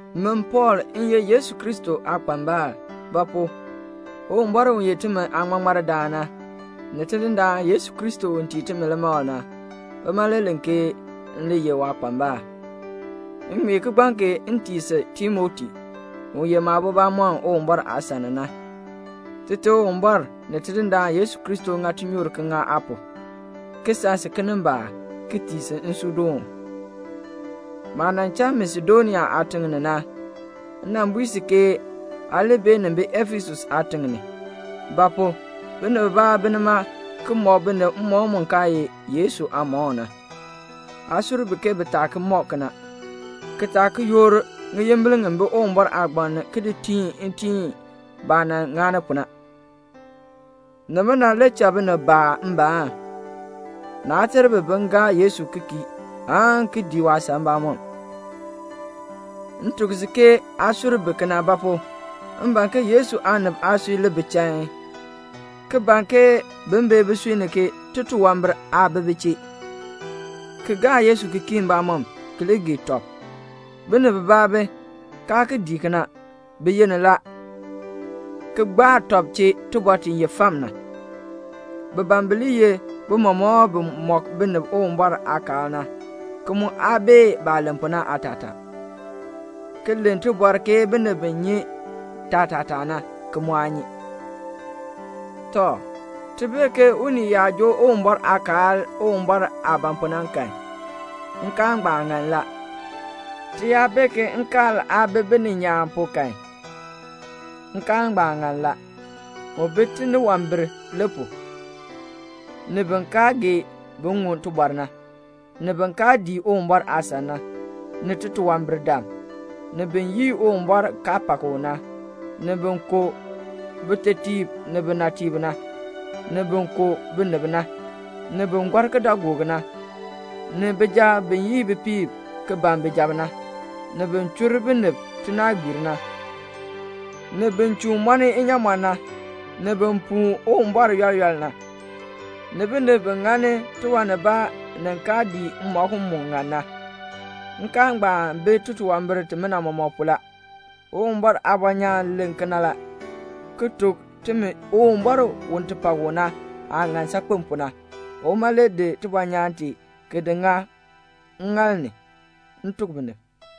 Min Pɔɔl m ye Yesu Kristo aakpambal; ba pu? Uwumbɔr u ye timi aaŋmaŋmardaan na, ni Tidindaan Yesu Kristo u tii timi limakl na, bima le len ke m li ye waakpambal. M ŋmee kigbaŋ kee m tii si Timoti, u ye maabo bamɔnn Uwumbɔr aasan ni na. Tite Uwumbɔr ni Tidindaan Yesu Kristo ŋa tinyoor ki ŋa aa pu, ki san si kinimbaak, ki tii si nsuudoon. Maah nan cha Masedonia aatiŋ ni na, m nan bui si ke aa li beenin bi Efesus aatiŋ ni; ba pu? binib bibaa bi nima ki mɔk binib mmɔkm mu kaa ye Yesu aamɔkm na. Aa sur bi ke bi taa ki mɔk kena, ki taa ki yoor ŋiyimbil ŋi bi Uwumbɔr aagbaŋ ni ki di tiin itiin baah nan ŋani pu na. Nimina le cha binib baa mbaan. Naa ter bi bin gaa Yesu ki kii aan ki dii waasan mbamɔm. M tuk si ke aa sur bi kena; ba pu? m ban ke Yesu aanib aasui li bi chain, ki ban ke bin bee bisui ni ke titunwambir aa bi bi chee, ki gaa Yesu ki kii mbamɔm, ki li gee tɔb. Binib bibaa bi, kaa ki dii kena. Bi yenn la, ki gbaa tɔb chee tibɔr ti ye fam na. Bi ban bi li ye bimɔmɔkb bi mɔk binib Uwumbɔr aakaal na, ki mu aa bee baah len pu na aatataa, ki len tibɔr ke binib bi nyi taatataa na, ki mu aa nyi. Tɔ, ti bee ke unii yaa joo Uwumbɔr aakaal Uwumbɔr aah ban pu na kan, nkaal ngbaan ŋan la. Ti yaa bee ke nkaal aa bi bininyaan pu kan, nkaal ngbaan ŋan la. Mu bi tiniwambir le pu, ni bin kaa gee bin ŋun tibɔr na, ni bin kaa dii Uwumbɔr aasan na, ni titunwambirdam, ni bin yii Uwumbɔr kaa pak u na, ni bin ku bitetiib ni binatiib na, ni bin ku binib na, ni bin gɔr kidaagook na, ni bijab bi yii bipiib ki ban bijab na, ni bin chur binib tinaagbiir na, ni bin chuun mɔni inyaamɔn na, ni bin puu Uwumbɔr yɔl yɔl na, ni binib bi ŋani tiwan nibaa ni kaa dii mmɔkm mu ŋan na. Nkaal ngbaan bi titunwambir timina mɔmɔk pu la. Uwumbɔr aabɔnyaan len kena la, ki tuk timi Uwumbɔr u ti pak u na aah ŋan saakpen pu na. Uma le di tibɔnyaan tee ki di ŋa ŋŋaal ni, m tuk binib.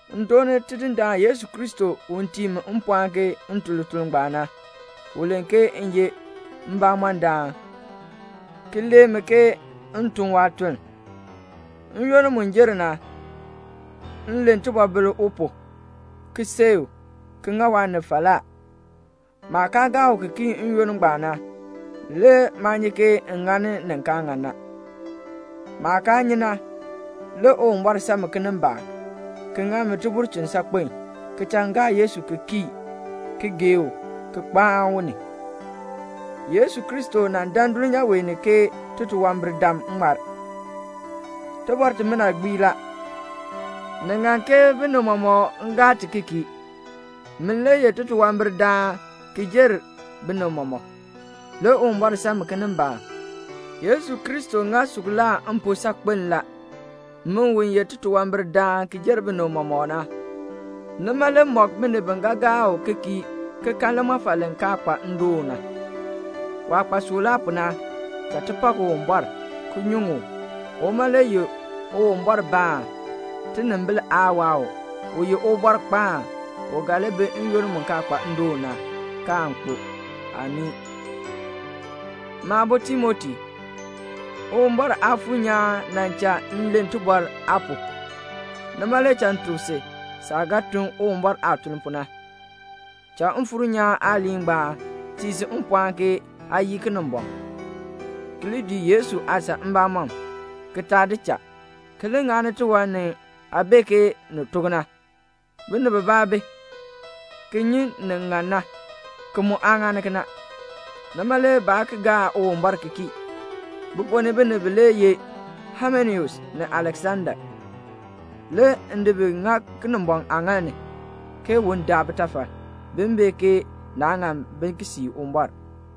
M dooni Tidindaan Yesu Kristo u tii mi mpɔɔn ke m tun lituln ngbaan na. U len ke m ye mbamɔndaan, ki lee mi ke m tun waatuln. N-yoonn mu jer na, m len tibɔbil u pu, ki seei u, ki ŋa waanib falaa. Maah kaa gaa u ki kii n-yoonn ngbaan na, le maa nyi ke m ŋani ni kaa ŋan na. Maah kaa nyi na, le Uwumbɔr san mi kinimbaak, ki ŋa mi tibulchin saakpen, ki cha m gaa Yesu Kristo ki kii ki gee u ki kpaan u ni. Yesu Kristo nan dan dulnyaa wee ni ke titunwambirdam ŋmar. Tibɔr timina gbii la. Ni ŋan ke binib mɔmɔk gaa ti ki kii. Min le ye titunwambirdaan ki jer binib mɔmɔk. Le Uwumbɔr san mi kinimbaak. Yesu Kristo ŋa suklaa m pu saakpen la, min u ye titunwambirdaan ki jer binib mɔmɔk na. Waah ŋa mi suklaa pu na, nima le mɔk binib bi ga gaa u ki kii ki kan limɔfal li kaa kpa ndoon na, waah kpa suklaa pu na. Cha ti pak Uwumbɔr, ki nyuŋ u. Uma le ye Uwumbɔrbaan, tinimbil aa waa u, u ye Ubɔrkpaan, u ga li bi n-yoonn mu kaa kpa ndoon na, kaan kpo. Amii. Maabo Timoti, Uwumbɔr Aafuur nyaan nan cha m len tibɔr aa pu, nima le cha m tuk si saah ga tun Uwumbɔr aatuln pu na. Cha Mfuur nyaan aaliin ngbaan tii si mpɔɔn ke aa yii Kinimbɔŋ, ki li dii Yesu aasan mbamɔm, ki taa di cha, ki li ŋani tiwan ni aa bee ke ni tok na. Binib bibaa bi, ki nyi nin ŋan na, ki mu aa ŋani kena. Nima le baa ki gaa Uwumbɔr ki kii. Bi ponn ni binib bilee ye Haimeneus ni Aleksanda. Le m di bi ki ŋa Kinimbɔŋ aaŋaal ni ke un daa bitafal, bin bee ke naa ŋan bi ki sii Uwumbɔr.